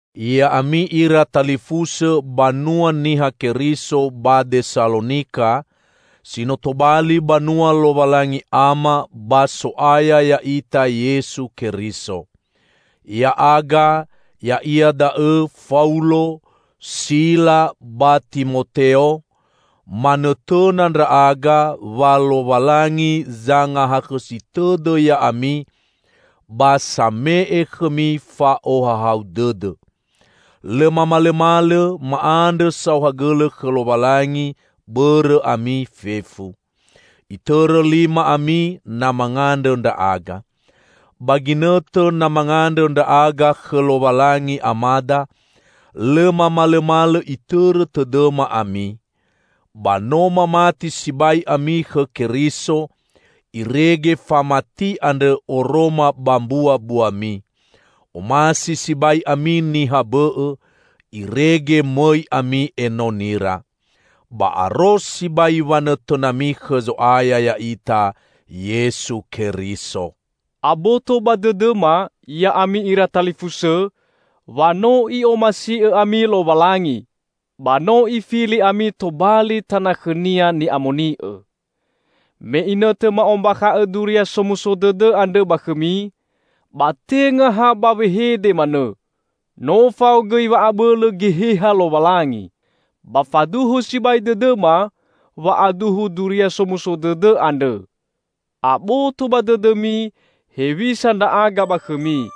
Ya'ami ira talifusõ banua Niha Keriso ba Desalonika, si no tobali banua Lowalangi Ama ba So'aya ya'ita Yesu Keriso: Ya'aga, ya'ia da'õ Faulo, Sila ba Timoteo manõtõna ndra'aga wa Lowalangi zangahakhõsi tõdõ ya'ami ba same'e khõmi fa'ohahau dõdõ. Lõ mamalõmalõ ma'andrõ saohagõlõ khõ Lowalangi bõrõ ami fefu. Itõrõ lima ami na mangandrõ ndra'aga. Ba ginõtõ na mangandrõ ndra'aga khõ Lowalangi Amada, lõ mamalõmalõ itõrõ tõdõma ami. Ba no mamati sibai ami khõ Keriso, irege famati andrõ oroma ba mbuabuami. Omasi sibai ami niha bõ'õ, irege mõi ami enonira. Ba aro sibai wanõtõnami khõ Zo'aya ya'ita Yesu Keriso. Aboto ba dõdõma, ya'ami ira talifusõ, wa no I'omasi'õ ami Lowalangi, ba no Ifili ami tobali tana khõ-Nia ni'amoni'õ. Me inõtõ ma'ombakha'õ Duria Somuso Dõdõ andrõ ba khõmi, ba tenga ha ba wehede manõ, no fao gõi wa'abõlõ Geheha Lowalangi. Ba faduhu sibai dõdõma wa'aduhu Duria Somuso Dõdõ andrõ. Aboto ba dõdõmi hewisa ndra'aga ba khõmi,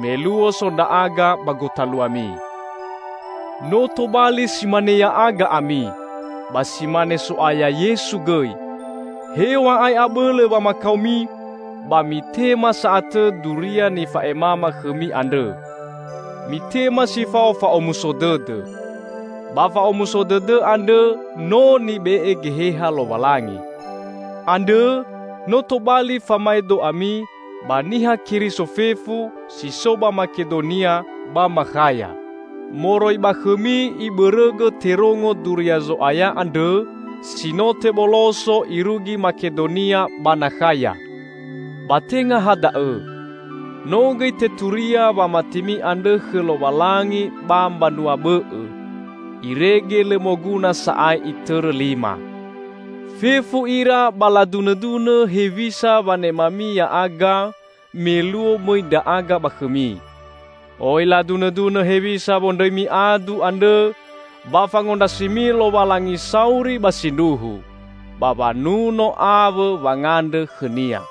me luo so ndra'aga ba gotaluami. No tobali si mane ya'aga ami, ba si mane So'aya Yesu gõi. Hew̃a'ae abõlõ wamakaomi, ba mitema sa'atõ Duria nifa'emama khõmi andrõ; mitema si fao fa'omuso dõdõ. Ba fa'omuso dõdõ andrõ no nibe'e Geheha Lowalangi. Andrõ no tobali famaedo ami ba Niha Keriso fefu si so ba Makedonia ba Makhaya. Moroi ba khõmi ibõrõgõ terongo Duria Zo'aya andrõ si no teboloso irugi Makedonia ba Nakhaya. Ba tenga ha da'õ; no gõi teturia wamatimi andrõ khõ Lowalangi ba mbanua bõ'õ, irege lõ moguna sa'ae itõrõ lima. Fefu ira ba ladunõdunõ hewisa wanemami ya'aga me luo mõi ndra'aga ba khõmi. Oi ladunõdunõ hewisa wondrõimi adu andrõ ba fangondrasimi Lowalangi sauri ba sindruhu, ba wanuno awõ wangandrõ khõ-Nia.